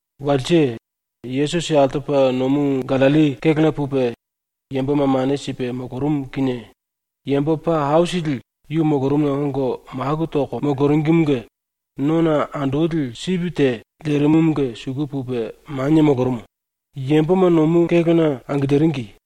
Walse Yesusi altopa nomu ⸤Gallilli⸥ kélona pupe yamboma mane sipe molorumu kinie yambo paa aisili yu molorumuna ongo maku toko moloringimunge nona andoli sipi te lerimumunge suku pupe manie molorumu, yamboma nomu kélona angiliringi.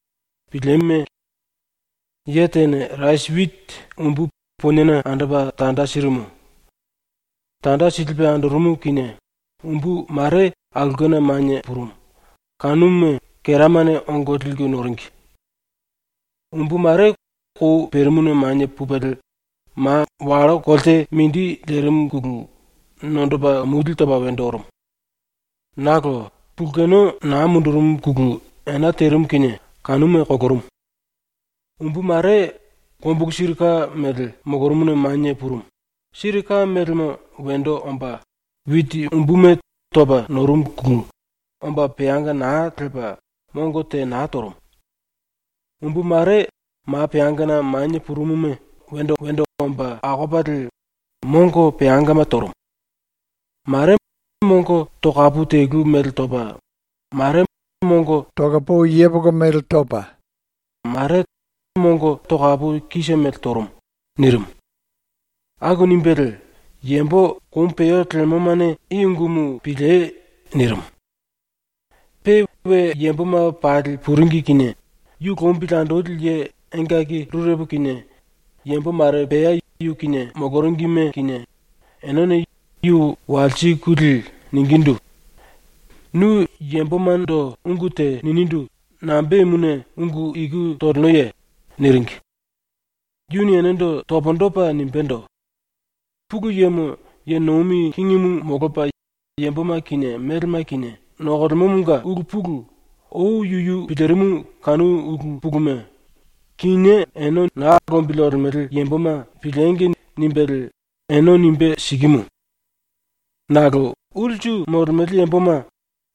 “Pilieme. Ye tene rasi witi umbu poniena andopa tanda sirimu. Tanda silipe andorumu kinie umbu mare aulkena manie purumu, kanuma keramane ongo liku noringi. Umbu mare kou perimuna manie pupelie ma wallo kolte mindi lerimuna nondopa mulie topa wendo orumu. Nakolo pulkeno naa mundurumuna ena terimu kinie kanuma kolorumu. Umbu mare kombulu siri ka mele molorumuna manie purumu, siri ka melemo wendo omba witi umbuma topa norumuna omba peanga naa lepa mongo te naa torumu. Umbu mare ma peangana manie purumuma wendo wendo omba akopalie mongo peangama torumu. Mare mongo tokapu telu mele topa, mare mongo tokapu talo mele topa, mare tokapu kise mele torumu.” ⸤nirimu.⸥ Aku nimbelie “Yambo komu peo lemomane i ungumu piliei.” nirimu. Pe we yamboma pali puringi kinie yu lombili andoli ye engaki rurepo kinie yambo mare pea yu kinie moloringime kinie, enene yu walsikulie ningindu: “Nu yambomando ungu te ninindu nambemuna ungu iku tolenoye?” niringi. Yuni enendo pundu topa nimbendo: “Pulu Yemo ye nomi kingimu molopa yamboma kinie melema kinie nokolemomonga ulu pulu ou yuyu pilirimu kanu ulu puluma ‘Kinié ene ⸤na lombili olemele yamboma⸥ piliengi!’ nimbelie ene nimbe sikimu. Nakolo ulsu molemele yamboma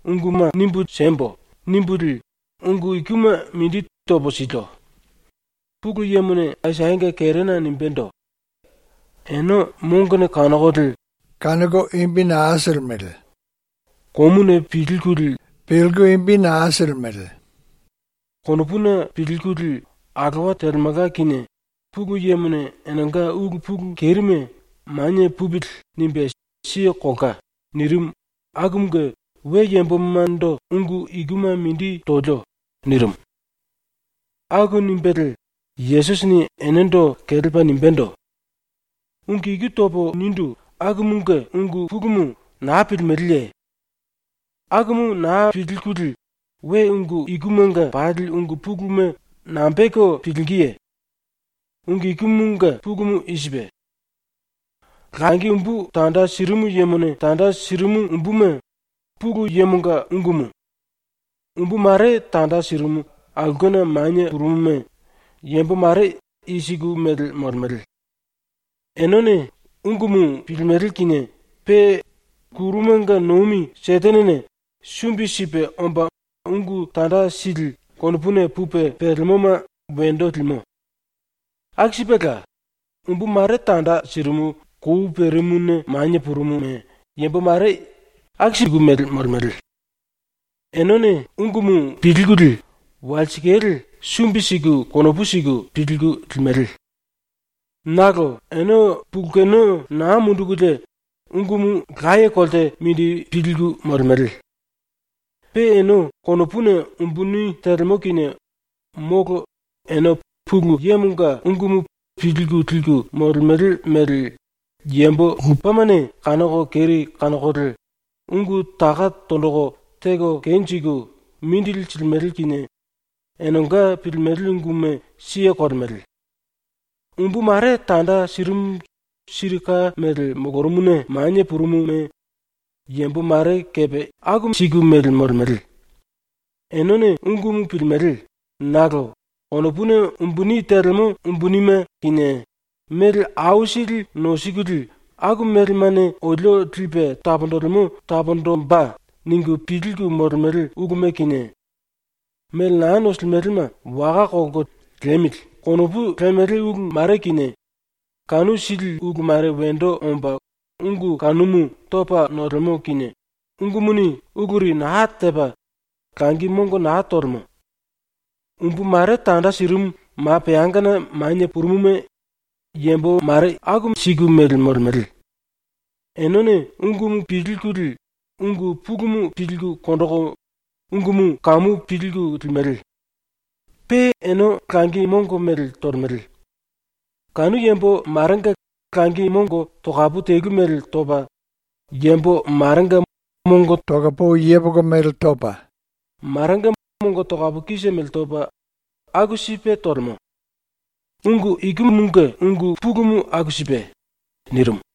‘Unguma nimbu siembo.’ nimbulie ungu ikuma mindi topo silio. ⸤Pulu Yemone Aisayanga kerena nimbendo:⸥ ‘Ene mongone kanokolie naa kanoko, komuni pilkulie naa pilimele. Konopuni pilkulie alowa telemelka kinie, ⸤Pulu Yemone⸥ enenga ulu pulu kerime ‘manie pupili.’ nimbe siye kolka.’ nirimu akumunge we yambomando ungu ikuma mindi tolio.” nirimu. Aku nimbelie Yesusini enendo kelepa nimbendo: “Ungu iku topo nindu akumunge ungu pulumu naa pilimeleye? Akumu naa pilkulie we ungu ikumanga pali ungu puluma nambe teko pilingíye? ⸤Ungu ikumunge pulumu i sipe:⸥ Langi umbu tanda sirimu yemone tanda sirimu umbuma ⸤Pulu Yemonga⸥ ungumu. Umbu mare tanda sirimu aulkena manie purumuma yambo mare i siku mele molemele. Enene ungumu pilimele kinie pe ⸤kurumanga nomi⸥ Setenene sumbi sipe omba ungu tanda sili konopuna pupe pelemoma wendo limo. Aku sipela, umbu mare tanda sirimu kou perimuna manie purumuma yambo mare i siku mele molemele. Enene ungumu pilkulie walsikale sumbi siku konopu siku pilku limele. Nakolo ene pulkeno naa mundukulie ungumu laye kolte mindi pilku molemele. Pe ene konopuna umbuni telemo kinie molo ene ⸤Pulu Yemonga⸥ ungumu pilku liku molemele mele yambo lupemane kanoko keri kanokolie ungu taka tonjiku teko kenjiku mindili silimele kinie enenga pilimele unguma siye kolemele. Umbu mare tanda sirimu siri ka mele molorumuna manie purumuma yambo mare kepe i siku mele molemele. Enene ungumu pilimele nakolo konopuna umbuni telemo umbunime kinie, mele aisili nosikulie ‘Aku melemane olio lipe taponjilimo taponjimbe.’ ningu pilku molemele uluma kinie, mele naa nosilimelema waka kolko ‘liemili.’ konopu lemele ulu mare kinie, kanu sili ulu mare wendo omba ungu kanumu topa nolemo kinie ungumuni uluri naa tepa langi mongo naa tolemo. Umbu mare tanda sirimu ma peangana manie purumuma yambo mare i siku mele molemele. Enene ungumu pilkulie ungu pulumu pilku konjiku ungumu kamu pilku limele. Pe ene langi mongo mele tolemele. Kanu yambo marenga langi mongo tokapu telu mele topa, yambo marenga mongo tokapu talo mele topa, marenga mongo tokapu kise mele topa, aku sipe tolemo. ⸤Ungu ikumunge ungu pulumu aku sipe.⸥” nirimu.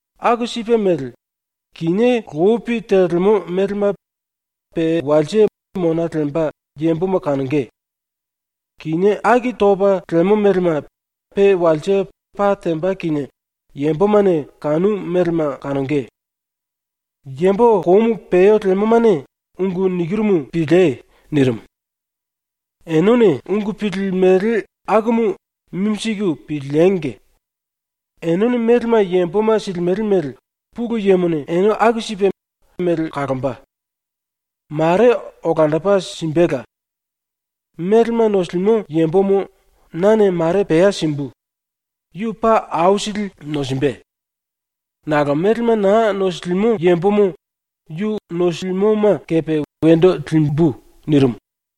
Aku sipe mele, kinié lopi telemo melema pe walse mona lemba yamboma kanonge; kinié aki topa lemo melema pe walse pa temba kinie yambomane kanu melema kanonge. Yambo komu peo lemomane ⸤ungu nikirumu⸥ piliei.” ⸤nirimu.⸥ “Enene ungu pilimele akumu mimi siku piliengi! Enene melema yamboma silimele mele ⸤Pulu Yemone⸥ ene aku sipe mele kalomba. Mare olandopa simbela. Melema nosilimo yambomo nane mare pea simbu, yu paa aisili nosimbe. Nakolo melema naa nosilimo yambomo yu nosilimoma kepe wendo limbu.” nirimu.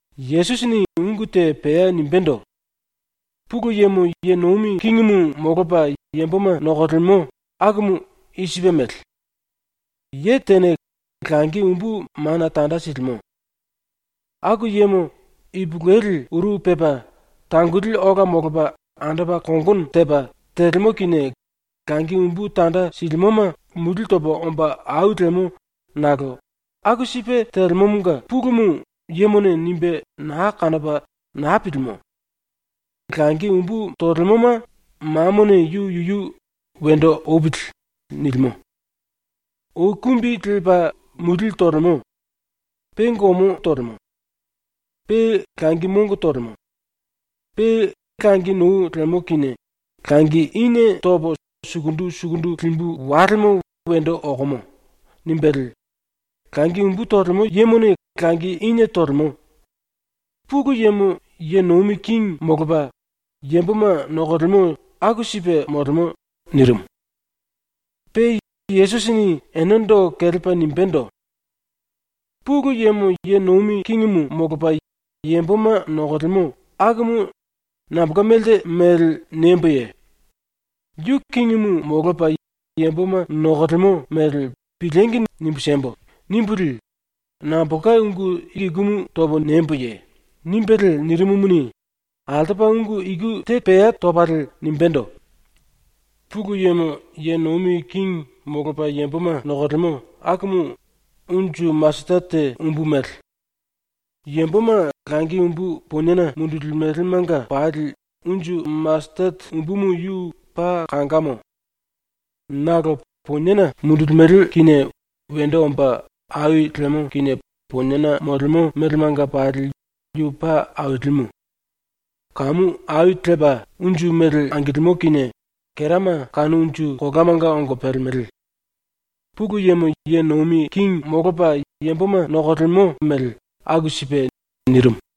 Yesusini ungu te pea nimbendo: “Pulu Yemo ye nomi kingimu molopa yamboma nokolemo akumu i sipe mele: “Ye tene langi umbu mana tanda silimo. Aku yemo ipulueli uru pepa, tangoli ola molopa ⸤andopa kongono tepa⸥, telemo kinie langi umbu tanda silimoma mulie topa omba ai lemo nakolo aku sipe telemomonga pulumu yemone nimbe naa kanopa naa pilimo. Langi umbu tolemoma mamone yu yuyu ‘wendo opili.’ nilimo. Ou kumbi lepa mulie tolemo. Pe gomo angilimo. Pe langi mongo tolemo. Pe langi nou lemo kinie ‘Langi inie topo sukundu sukundu limbu walemo wendo okomo.’ nimbelie langi umbu tolemo yemone langi inie tolemo. ⸤Pulu Yemo ye nomi kingi molopa yamboma nokolemo aku sipe molemo.⸥” nirimu. Pe Yesusini enendo kelepa nimbendo: “Pulu Yemo ye nomi kingimu molopa yamboma nokolemo akumu nambolka melte mele niemboye? ‘Yu kingimu molopa yamboma nokolemo mele piliengi nimbu siembo.’ nimbulie nambolka ungu ikumu topo niemboye?” ⸤nimbelie nirimumuni, altopa ungu iku te pea topalie nimbendo:⸥ “Pulu Yemo ye nomi kingi molopa yamboma nokolemo akumu unju masetete umbu mele: Yamboma langi umbu poniena mundulimelemanga pali unju masetete umbumu yu paa kangamo. Nakolo poniena mundulimele kinie wendo omba ai lemo kinie poniena molemo melemanga pali yu paa ailimu. Kamu ai lepa unju mele angilimo kinie kerama kanu unju kolamanga ongo pelemele. Pulu Yemo ye nomi kingi molomba mele aku sipe.” nirimu.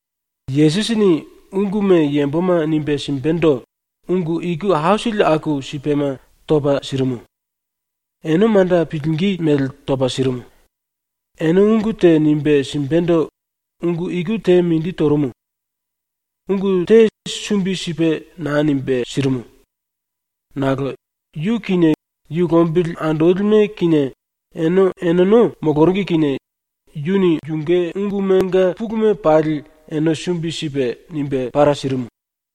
Yesusini unguma yamboma nimbe simbendo ungu iku aisili aku sipema topa sirimu. Ene manda pilingí mele topa sirimu. Ene ungu te nimbe simbendo ungu iku te mindi torumu. ⸤Ungu te sumbi sipe naa nimbe sirimu.⸥ Nakolo yu kinie yu lombili andolime kinie ene eneno moloringi kinie yuni yunge ungumanga puluma pali ene sumbi sipe nimbe para sirimu.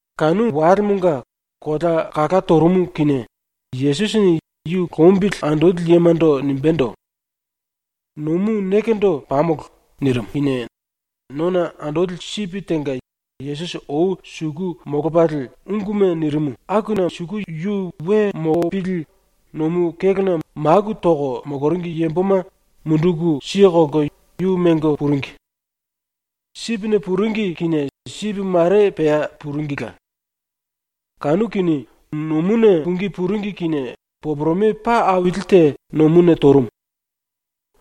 Kanu walemonga kolea kala torumu kinie Yesusini yu lombili andoli yemando nimbendo: “Nomu nekendo pamolo.” nirimu kinie nona andoli sipi tenga Yesusi ou suku molopalie unguma nirimu akuna suku yu we molopili nomu kélona maku toko moloringi yamboma munduku kelko yu mengo puringi. Sipine puringi kinie sipi mare pea puringila. Kanu kinie, nomuna pungí puringi kinie poporome paa aili te nomuna torumu.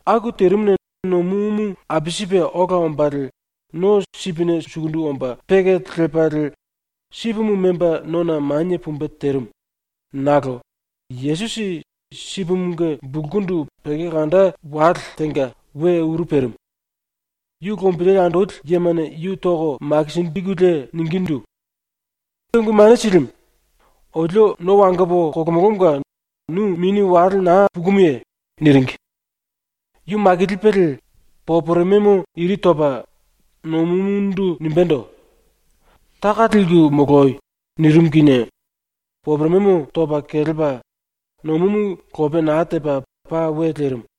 Aku terimuna nomumu apisipe ola ombalie no sipine sukundu sukundu omba peke lepalie sipimu memba nona manie pumbe terimu nakolo Yesusi sipimunge bulkundu penge kanda wale tenga we uru perimu. Yu lombili andoli yemane yu toko makinjikulie ningindu: “Ungu Mane Silimu, olio no wangopo kolomolomonga nu mini wale naa pukumuye?” niringi. Yu makilipelie poporomemo iri topa nomumundu nimbendo: “Taka lelko moloi!” nirimu kinie poporomemo topa kelepa nomumu lope naa tepa paa we lerimu.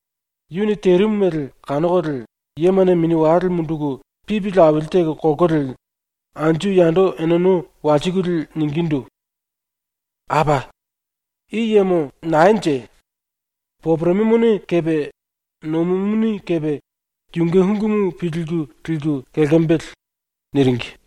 ⸤Yuni terimu mele kanokolie⸥ yemane mini wale munduku pipili aili teko kolkolie anju yando eneno walsikulie ningindu: “Apa! I yemo naenje? Poporomemone kepe nomumuni kepe yunge ungumu pilku liku kelkembele.” niringi.